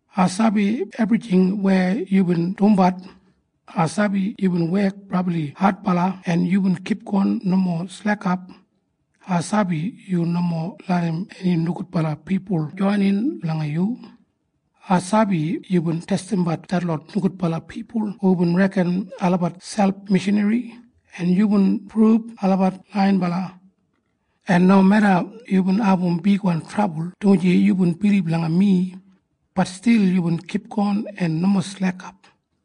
“Ai sabi ebrijing weya yubin dumbat. Ai sabi yubin wek brabli adbala en yubin kipgon nomo slekap. Ai sabi yu nomo larram eni nogudbala pipul joinin langa yu. Ai sabi yubin testimbat detlot nogudbala pipul hubin reken olabat selp mishanri, en yubin prub olabat laiyinbala. En nomeda yubin abum bigwan trabul dumaji yubin bilib langa mi, bat stil yubin kipgon en nomo slekap.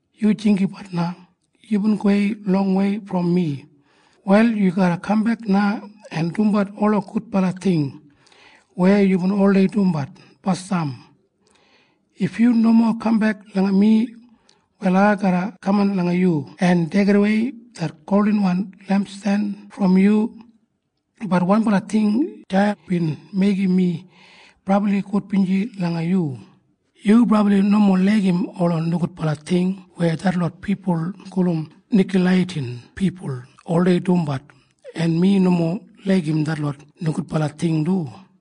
Yu jinggabat na. Yubin gowei longwei brom mi. Wal yu garra kambek na en dumbat ola gudbala ting weya yubin oldei dumbat basdam. If yu nomo kambek langa mi, wal ai garra kaman langa yu en deigidawei det goldinwan lempsten brom yu. Bat wanbala ting deya bin meigim mi brabli gudbinji langa yu. Yu brabli nomo laigim ola nogudbala ting weya detlot pipul gulum Nikoleiyatin pipul oldei dumbat, en mi nomo laigim detlot nogudbala ting du.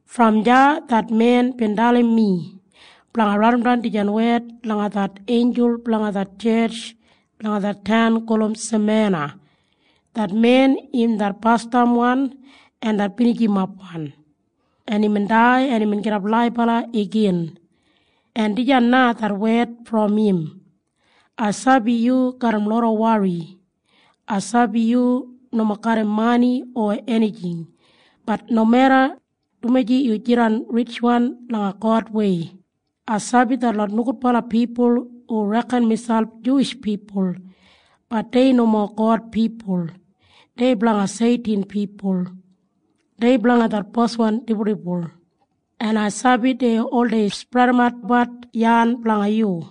Brom deya det men bin dalim mi blanga raidimdan dijan wed langa det einjul blanga det tjetj langa det taun gulum Semena. Det men im det Basdamwan en det Binijimapwan, en imbin dai en imbin gidap laibala igin. En dijan na det wed brom im. “Ai sabi yu garram loda wori. Ai sabi yu nomo garram mani o enijing. Bat nomeda, dumaji yu jidan ritjwan langa Godwei. Ai sabi detlot nogudbala pipul hu reken miselp Juwish pipul. Bat dei nomo God pipul. Dei blanga Seitin pipul. Dei blanga det boswan dibuldibul. En ai sabi dei oldei spredimatbat yan blanga yu.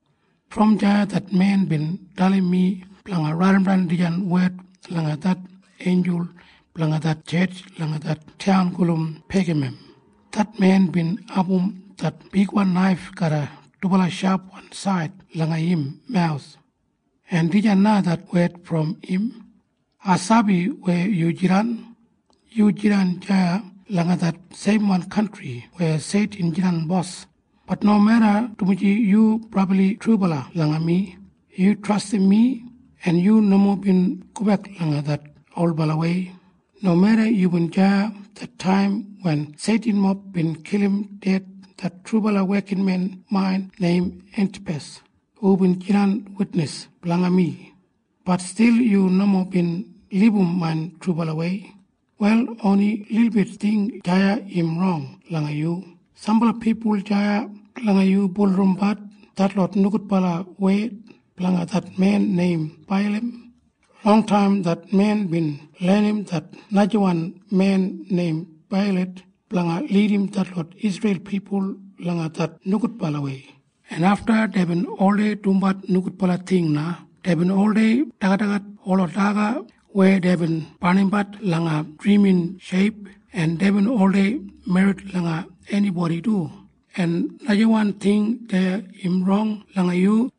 Brom deya det men bin dalim mi blanga raidimdan dijan wed langa det einjul blanga det tjetj langa det taun gulum Pegamam. Det men bin abum det bigwan naif garram dubala shapwan said langa im mawus. En dijan na det wed brom im. “Ai sabi weya yu jidan. Yu jidan deya langa det seimwan kantri weya Seitin jidan bos. Bat nomeda, dumaji yu brabli trubala langa mi. Yu trastim mi, en yu nomo bin gobek langa det olbalawei. Nomeda yubin deya det taim wen Seitinmob bin kilim ded det trubala wekinmen main neim Entipas hubin jidan witnis blanga mi, bat stil yu nomo bin libum main trubalawei. “Wal oni lilbit ting deya im rong langa yu. Sambala pipul deya langa yu bulurrumbat detlot nogudbala wed blanga det men neim Beilam. Longtaim det men bin lenim det najawan men neim Beilak blanga lidim detlot Isreil pipul langa det nogudbalawei, en afta deibin oldei dumbat nogudbala ting na. Deibin oldei dagadagat ola daga weya deibin barnimbat langa drimin sheip, en deibin oldei merrit langa enibodi du. “En najawan ting deya im rong langa yu.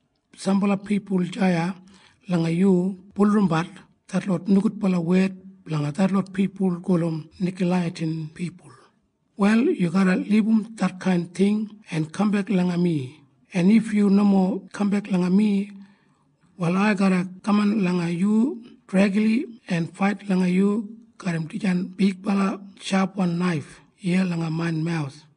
Sambala pipul deya langa yu bulurrumbat detlot nogudbala wed blanga detlot pipul gulum Nikoleiyatin pipul. “Wal yu garra libum detkain ting en kambek langa mi. En if yu nomo kambek langa mi, wal ai garra kaman langa yu dregli en fait langa yu garram dijan bigbala shapwan naif iya langa main mawus.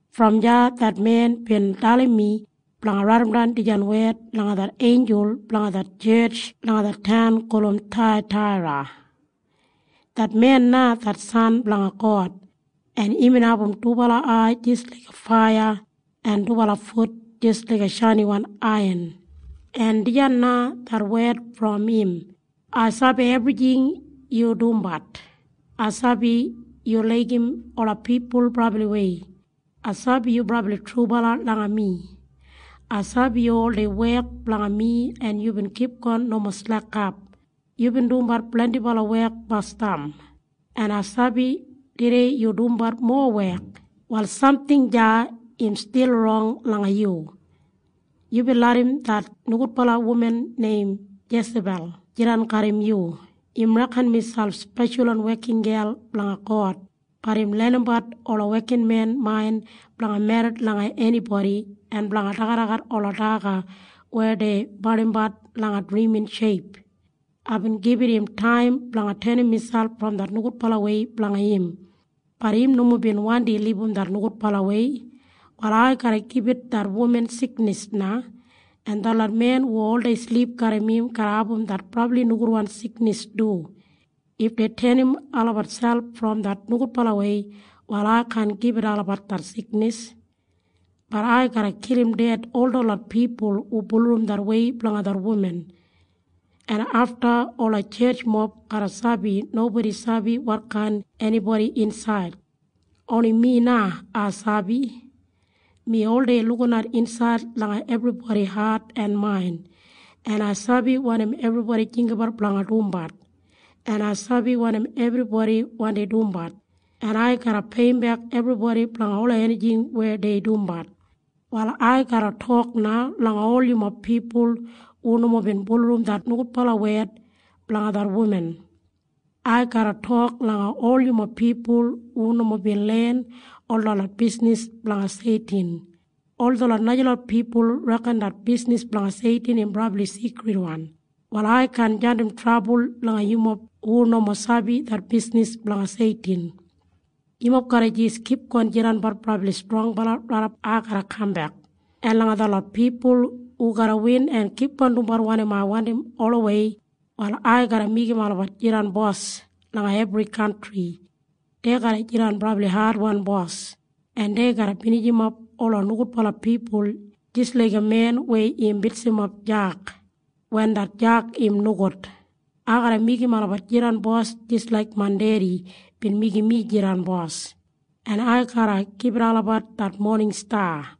Brom deya det men bin dalim mi blanga raidimdan dijan wed langa det einjul blanga det tjetj langa det taun gulum Thaiyataira. Det men na det San blanga God, en imbin abum dubala ai jis laiga faiya en dubala fut jis laiga shainiwan aiyan. En dijan na det wed brom im. “Ai sabi ebrijing yu dumbat. Ai sabi yu laigim ola pipul brabliwei. Ai sabi yu brabli trubala langa mi. Ai sabi yu oldei wek blanga mi en yubin kipgon nomo slekap. Yubin dumbat blendibala wek basdam, en ai sabi tudei yu dumbat mowa wek. “Wal samting deya im stil rong langa yu. Yubin larram det nogudbala wuman neim Jesabel jidan garram yu. Im reken miselp speshalwan wekingel blanga God. Bat im lenimbat ola wekinmen main blanga merrit langa enibodi en blanga dagadagat ola daga weya dei barnimbat langa drimin sheip. Aibin gibit im taim blanga tenim miselp brom det nogudbalawei blanga im. Bat im nomo bin wandi libum det nogudbalawei. “Wal ai garra gibit det wuman siknis na. En detlot men hu oldei silip garram im garra abum det brabli nogudwan siknis du. If dei tenim olabat selp brom det nogudbalawei, wal ai kaan gibit olabat det siknis. Bat ai garra kilim ded ol detlot pipul hu bulurrum det wei blanga det wuman. En afta ola tjetjmob garra sabi nobodi sabi wotkain enibodi insaid. Oni mi na ai sabi. Mi oldei lukinat insaid langa ebribodi hat en main, en ai sabi wanim ebribodi jinggabat blanga dumbat, en ai sabi wanim ebribodi wandi dumbat. En ai garra peiyimbek ebribodi blanga ola enijing weya dei dumbat. “Wal ai garra tok na langa ol yumob pipul hu nomo bin bulurrum det nogudbala wed blanga det wuman. Ai garra tok langa ol yumob pipul hu nomo bin len ol detlot bisnis blanga Seitin. Ol detlot najalot pipul reken det bisnis blanga Seitin im brabli sigridwan. “Wal ai kaan jandim trabul langa yumob hu nomo sabi det bisnis blanga Seitin. Yumob garra jis kipgon jidanbat brabli strongbala raidap ai garra kambek. En langa detlot pipul hu garra win en kipgon dumbat wanim ai wandim olawei, wal ai garra meigim olabat jidan bos langa ebri kantri. Dei garra jidan brabli adwan bos, en dei garra binijimap ola nogudbala pipul jis laiga men weya im bitsimap jag wen det jag im nogud. Ai garra meigim olabat jidan bos jis laik main Dedi bin meigim mi jidan Bos. En ai garra gibit olabat det moning sta.